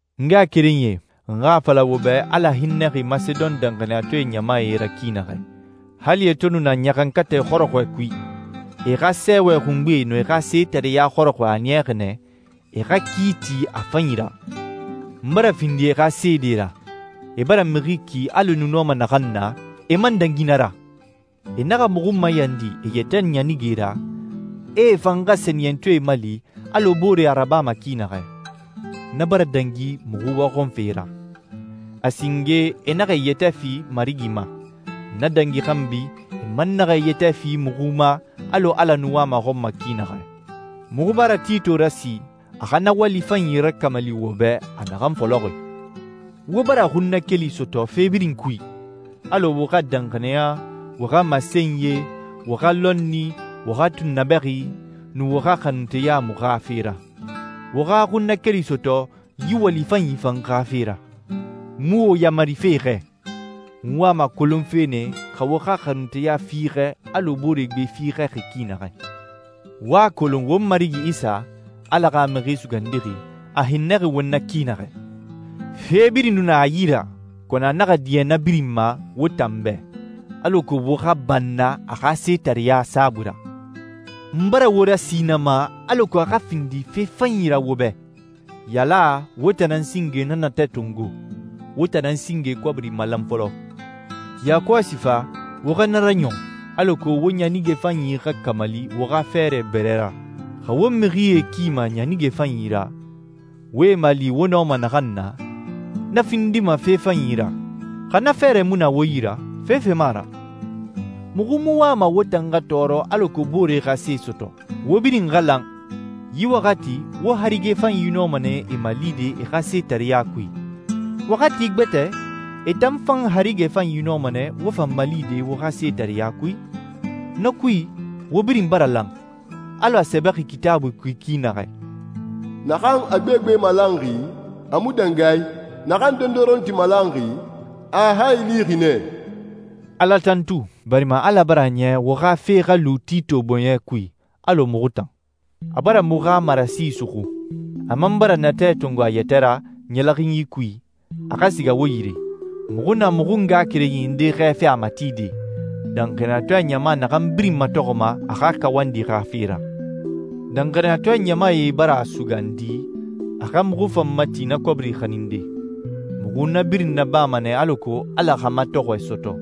N ngaxakerenyie, n xa a fala wo bɛ Ala hinnɛxi Masedon danxaniyatɔɛ ɲamae ra ki naxɛ. Hali e to nu na ɲaxankatɛ xɔrɔxɔɛ kui, e xa sɛɛwɛ xungbe nun e xa setareɲa xɔrɔxɔɛ a niyaxi nɛ e xa ki ti a fanyi ra. N bara findi e xa seede ra. E bara mixi ki alɔ e nu nɔma naxan na, e man dangi na ra. E naxa muxu mayandi e yɛtɛ ɲanige ra, a e fan xa sɛniyɛntɔɛe mali alɔ booree a rabama ki naxɛ. Na bara dangi muxu waxɔnfe ra. A singe e naxa e yɛtɛ fi Marigi ma. Na dangi xanbi, e man naxa e yɛtɛ fi muxu ma alɔ Ala nu wama a xɔn ma ki naxɛ. Muxu bara Tito rasi, a xa na wali fanyi rakamali wo bɛ a naxan fɔlɔxi. Wo bara xunnakeli sɔtɔ fe birin kui, alɔ wo xa danxaniya, wo xa masenyie, wo xa lɔnni, wo xa tunnabɛxi, nun wo xa xanunteya muxu xa fe ra. Wo xa xunnakeli sɔtɔ yi wali fanyi fan xa fe ra. N mu wo yamarife xɛ. N wama a kolonfe nɛ xa wo xa xanunteya fiixɛ alɔ booree gbe fiixɛxi ki naxɛ. Wo a kolon won Marigi Isa, Ala xa Mixi Sugandixi, a hinnɛxi won na ki naxɛ. Fe birin nu na a yi ra, kɔnɔ a naxa diɲɛ na birin ma wo tan bɛ, alako wo xa banna a xa setareɲa saabui ra. N bara wo rasi na ma alako a xa findi fe fanyi ra wo bɛ. Yaala wo tan nan singe na natɛ tongo, wo tan nan singe kɔbiri malan fɔlɔ. Yakɔsi fa, wo xa na raɲɔn, alako wo ɲanige fanyi xa kamali wo xa fɛɛrɛ bɛrɛ ra. Xa wo mixie kima ɲanige fanyi ra, wo e mali wo nɔma naxan na, na findima fe fanyi ra. Xa na fɛɛrɛ mu na wo yi ra, fefe mu a ra. Muxu mu wama wo tan xa tɔɔrɔ alako booree xa se sɔtɔ. Wo birin xa lan. Yi waxati, wo harige fanyi nɔma nɛ e malide e xa setareɲa kui. Waxati gbɛtɛ, e tan fan harige fanyi nɔma nɛ wo fan malide wo xa setareɲa kui. Na kui, wo birin bara lan, alɔ a sɛbɛxi Kitaabui kui ki naxɛ, «Naxan a gbegbe malanxi, a mu dangi a i. Naxan dondoronti malanxi, a a hayi lixi nɛ.» Ala tantu, barima Ala bara a niya wo xa fe xa lu Tito bɔɲɛ kui, alɔ muxu tan. A bara muxu xa marasi suxu. A man bara natɛ tongo a yɛtɛ ra ɲɛlɛxinyi kui, a xa siga wo yire. Muxu na muxu ngaxakerenyi nde xɛɛfe a matide, danxaniyatɔɛ ɲama naxan birin matɔxɔma a xa kawandi xa fe ra. Danxaniyatɔɛ ɲamae bara a sugandi a xa muxu fan mati na kɔbiri xaninde. Muxu na birin nabama nɛ alako Ala xa matɔxɔɛ sɔtɔ,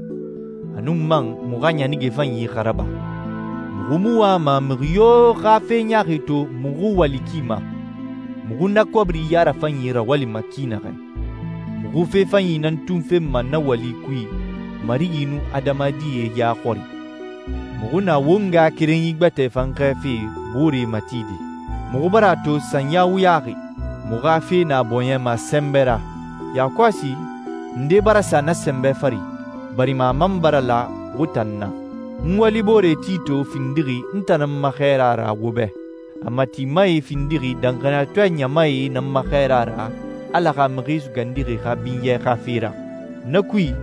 a nun man muxu xa ɲanige fanyi xa raba. Muxu mu wama mixi yo xa fe ɲaaxi to muxu wali ki ma, muxu na kɔbiri ya rafanyi rawalima ki naxɛ. Muxu fe fanyi nan tun fenma na wali kui Marigi nun adamadie ya xɔri. Muxu na won ngaxakerenyi gbɛtɛ fan xɛɛfe booree matide. Muxu bara a to sanya wuyaxi, muxu xa fe na a bɔɲɛ ma sɛnbɛ ra. Yakɔsi, nde bara sa na sɛnbɛ fari, barima a man bara la wo tan na. N waliboore Tito findixi n tan nan ma xɛɛra ra wo bɛ. A matimae findixi danxaniyatɔɛ ɲamae nan ma xɛɛrae ra Ala xa Mixi Sugandixi xa binyɛ xa fe ra. Na kui,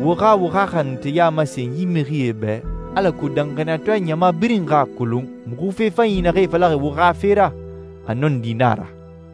wo xa wo xa xanunteya masen yi mixie bɛ alako danxaniyatɔɛ ɲama birin xa a kolon muxu fe fanyi naxee falaxi wo xa fe ra, a nɔndi na a ra.